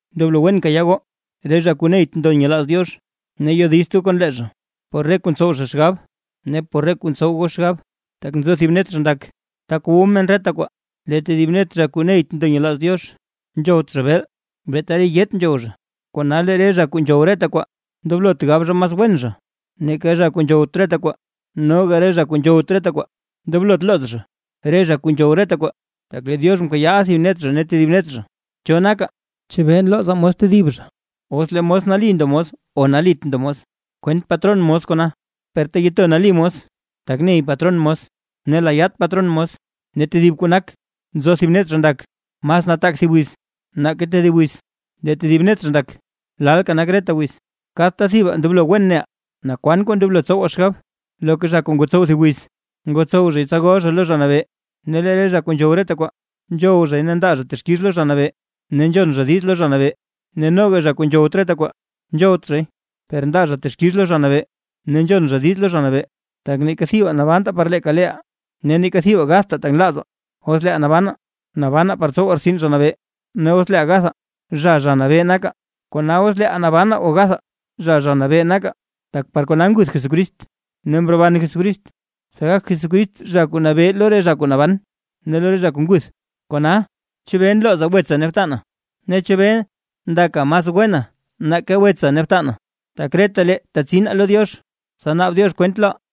Ndoblo wen kayaa goo, re zha kuu neyt ndo nyelaaz Diox, ne yodizt goo kon lee zha por re kuu ntsow zha xgab ne por re kuu ntsow goo xgab. Tak nzo thib net zha ndak, tak wu men reta kwaa, lee tedib net zha kuu neyt ndo nyelaaz Diox, nzhowt zha beel, beeta re yaat nzhow zha. Kona lee re zha kuu nzhow reta kwaa, ndoblot gab zha mas wen zha nake zha kuu nzhowt reta kwaa. Noga re zha kuu nzhowt reta kwaa, ndoblot looz zha re zha kuu nzhow reta kwaa, tak lee Diox mkayaaʼa thib net zha ne tedib net zha. ¿Cho naka, chebee nlooza mos tedib zha? Os lee mos nali ndo mos o nalit ndo mos, kwent patron mos kona; per teyeto nali mos tak ney patron mos ne layaat patron mos. Ne tedib kuu nak: Nzo thib net zha ndak mas nataak thib wiz, nake tedib wiz, lee tedib net zha ndak lalka nak reta wiz. Kadta thibaa ndoblo wen neʼaa naa kwan kuu ndoblo tsowaa xgab. Loka zha kuu ngotsow thib wiz, ngotsow zhay tsa gol zha lo Zha Nabee. Ne lee zha kuu nzhow reta kwaa, nzhow zhay ne ndaa zha texkix lo Zha Nabee, ne nzhon zha diiz lo Zha Nabee; ne noga zha kuu nzhowt reta kwaa, nzhowt zhay, per ndaa zha texkix lo Zha Nabee ne nzhon zha diiz lo Zha Nabee. Tak neeka thibaa nabantaa par leeka leeʼaa, ne neeka thibaa gadtaa tak nlaazaa. Os leeʼaa nabanaa, nabanaa par tsowaa rtsin Zha Nabee, ne os leeʼaa gathaa, zha Zha Nabee nakaa. Kona os leeʼaa nabanaa o gathaa zha Zha Nabee nakaa. Tak par kona nguth Jesucrist ne mroban Jesucrist, tsa gak Jesucrist Zha Nabee lo re zha kuu naban ne lo re zha kuu ngutha. Kona, ¿chebee nlooza wetsa ne btana? ne ¿chebee ndaka mas wena nake wetsa ne btana? tak retalee tetsinaa lo Diox, tsa naab Diox kwent loʼaa.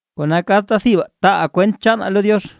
Kona kadta thibaa taaʼaa kwent chaanaa lo Diox.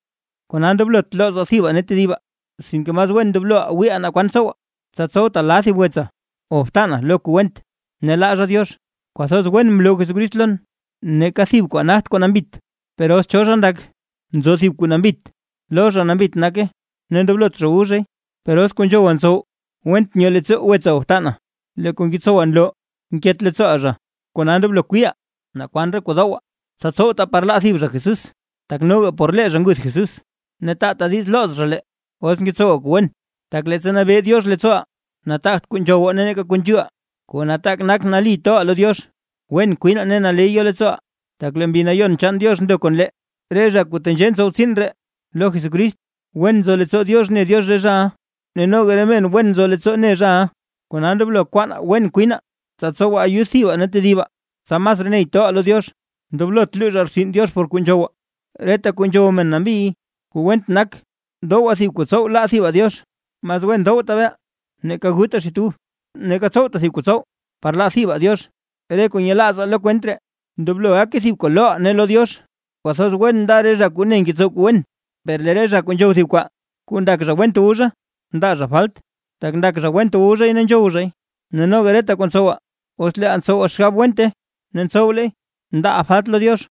Kona ndoblot loozaa thibaa ne tedibaa. Sinke mas wen ndobloʼaa wiiʼaa naa kwan tsowaa, tsa tsowtaa la thib wetsaa o btanaa lo kuu went ne laa zha Diox. Kwathoz wen mloo Jesucrist lon, neeka thib kwaa nagt kuu nambit, per os cho zha ndak nzo thib kuu nambit, lo zha nambit nake ne ndoblot zha wu zhay. Per os kuu nzhowaa ntsow went nyoo leettsoo wetsaa o btanaa, lee kuu ngetsowaa nloo nket leettsooʼaa zha. Kona ndoblo wiiʼaa naa kwan re kuu dowaa, tsa tsowtaa par laa thib zha Jesús, tak noga por lee zha nguth Jesús. Ne taata diiz looz zha lee, os ngetsowaa kuu wen. Tak leettsa nabee Diox leettsooʼaa, nataagt kuu nzhowaa neeka kuu nzhuuʼaa, kuu nataak nak nali toʼaa lo Diox, wen kwinaa ne naley yo leettsooʼaa, tak lee Mbi Nayon chaan Diox ndo kon lee. Re zha kuu tenzhee ntsow tsiin ree lo Jesucrist, wen nzo leettsoo Diox ne Diox re zhaʼa, ne noga re men wen nzo leettsoo ne zhaʼa. Kona ndoblo kwaanaa wen kwinaa; tsa tsowaa ayud thibaa ne tedibaa, tsa masraa ney toʼaa lo Diox. Ndoblot luuzhaa rtsin Diox por kuu nzhowaa, reta kuu nzhow men nambiy, kuu went nak dowaa thib kuu tsow laa thibaa Diox. Mas wen dowtaa beel, neeka gutaa xit ub, neeka tsowtaa thib kuu tsow par laa thibaa Diox. Re kuu nyelaazaa lo kwent ree, ndoblo gake thib kuu loʼaa ne lo Diox. ¡Kwathoz wen nda re zha kuu ne ngetsow kuu wen! Per lee zha kuu nzhow thib kwaa kuu ndak zha went wu zha, ndaa zha falt, tak ndak zha went wu zhay ne nzhow zhay, ne noga reta kuu ntsowaa, os leeʼaa ntsowaa xgab wente ne ntsowleey, ndaaʼaa falt lo Diox.